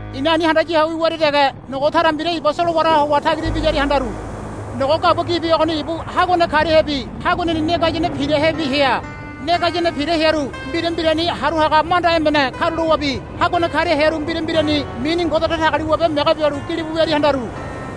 I̱na ani handaya ho wiwaria dege nogo tara mbira iba solowaraha howa tagira ibiyaria handaru. Nogo gabua gibi ogoni ibu haguane kariahebi haguaneni ne gayane pirahebi hea. Ne gayane pira hearu mbira mbirani haru haga manda emene karulowabi haguane karia hearu mbira mbirani mini Ngode Datagaliwabe mege bialu gilibu wiaria handaru.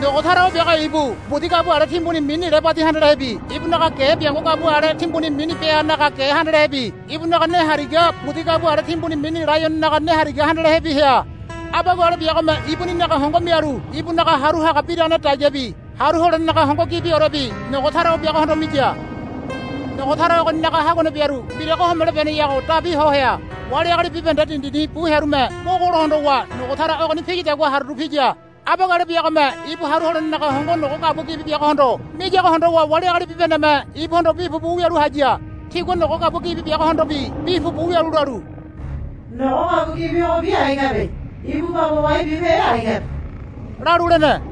Nogo tara o biago ibu budi gabua ale timbuni mini lebadi handalehebi ibunaga ge biango gabua ale timbuni mini beanaga ge handalehebi ibunaga ne hariga budi gabua ale timbuni mini laiononaga ne hariga handalehe hea. Abagua ale biagome ibuninaga hongo mialu ibunaga haru haga biragane dagiabi haru holenenaga hongo gibiorebi nogo tara o biagohondo miya. Nogo tara ogoninaga haguane biaru mbirago homelo beneyago dabi ho hea. Wali agali bibahende dindini bu hearume mogolo hondowa nogo tara ogoni piyadagua haruru piya. Abagua ale biagome ibu haru holenenaga hongo nogo gabua gibi biagohondo miyago hondowa wali agali bibahendeme ibuhondo bi pupu wialu haya. Tigua nogo gabua gibi biagohondobi bi pupu wialu lalu, Nogo gabua gibi ogobi ai kabe. Ibu baba wai bibehe ai kabe, lalu lene.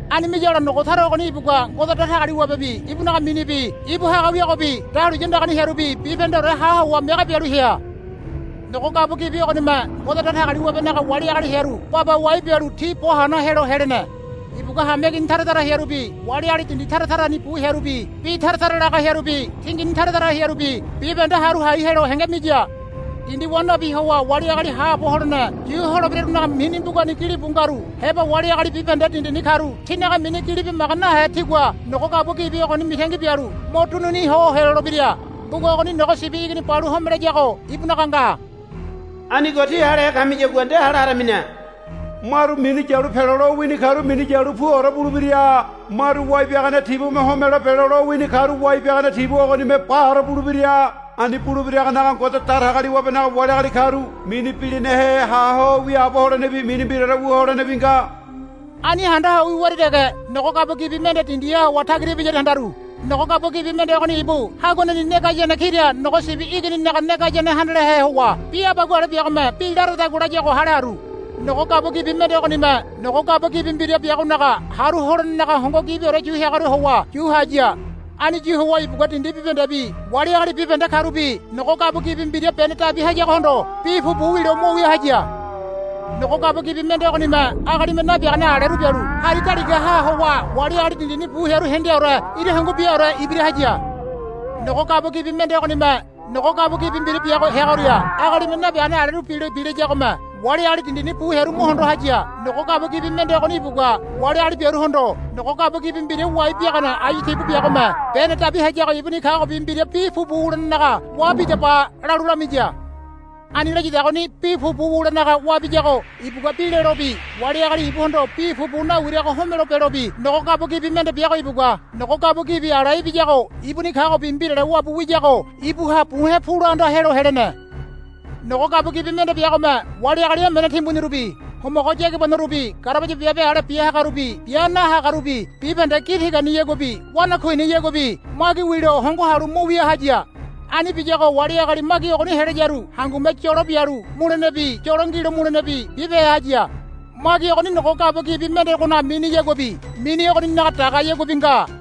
Ani miyagola nogo tara ogoni ibugua Ngode Datagaliwabebi ibunaga minibi ibu haga wiagobi dahuliya andagani hearubi bibahendeore ha howa mege bialu hea. Nogo gabua gibi ogonime Ngode Datagaliwabenaga wali agali hearu baba wai bialu ti bo hana helo helene. Ibugua hameigini tara tara hearubi wali agali dindi tara tarani bu hearubi bi tara tara laga hearubi tingini tara tara hearubi bibahende haru hai helo henge miya. Dindi wa nabi howa wali agali haabo holene yu holebirarunaga mini mbugani gilibu ngaru heba wali agali bibahende dindini karu tinaga mini gili bimaga nahe tigua nogo gabua gibi ogoni mitangi bialu mo dunini ho helolebira. Mbuga ogoni Nogo Sibi Igini balu homelayago ibunaga nga. Anigo tí halehe kamiyagua nde hale haramine. Maru minu yalu pelo lowini karu minu yalu puore bulebira. Maru wai biagane tibume homelo belo lowini karu wai biagane tibu ogonime baore bulebira. Ani bulebiragonaga Ngode Datagaliwabenaga wali agali karu mini bilinahe ha ho wiaabo holenebi mini mbiraore wu holenebi nga. Ani handa ho wiwaria dege nogo gabua gibi mende dindiha howa tagira ibiyaria handaru. Nogo gabua gibi mende ogoni ibu haguaneni ne gayane kira nogo sibi igininaga ne gayane handalehe howa bi abagua ale biagome bi laradagua layago hale haru. Nogo gabua gibi mende ogonime nogo gabua gibi mbira biagonaga haru holenenaga hongo gibiore yu heagoria howa yu haya. Ani yu howa ibugua dindi bibahendebi wali agali bibahende karubi nogo gabua gibi mbira bene dabi hayagohondo bi pupu wilo mo wia haya. Nogo gabua gibi mende ogonime agalime nabiagane aleru bialu hari daligaha howa wali agali dindini bu hearu hendeaore ira hungu biaore ibira haya. Nogo gabua gibi mende ogonime nogo gabua gibi mbira biago heagoria agalime nabiagane aleru bilo bilayagome wali agali dindini bu hearu mo hondo haya. Nogo gabua gibi mende ogoni ibugua wali agali biaruhondo, Nogo gabua gibi mbira wai biagane ayu tibu biagome bene dabi hayago ibuni kagobi mbira bi pupu wulenenaga wa bidaba, lalu lamiya. Ani layadagoni bi pupu wulenaga wabiyago ibugua bi lelobi wali agali ibuhondo bi pupu nawirago homelo belobi nogo gabua gibi mende biago ibugua nogo gabua gibi ala ibiyago ibuni kagobi mbirale wabu wiyago ibuha buhe̱ pula anda helo helene. Nogo gabua gibi mende biagome wali agali emene timbunirubi homogo yagibanorubi garabaya biabe ale bia hagarubi bia nahagarubi bibahende gi tiganiyaguabi wanakuiniyaguabi magi wilo hongo halu mo wia haya. Ani biyago wali agali magi ogoni helayaru hangume yolo bialu mulenebi yolo ngilo mulenebi bibehe haya. Magi ogoni nogo gabua gibi mendegonaga miniyaguabi mini ogoninaga dagayaguabi nga.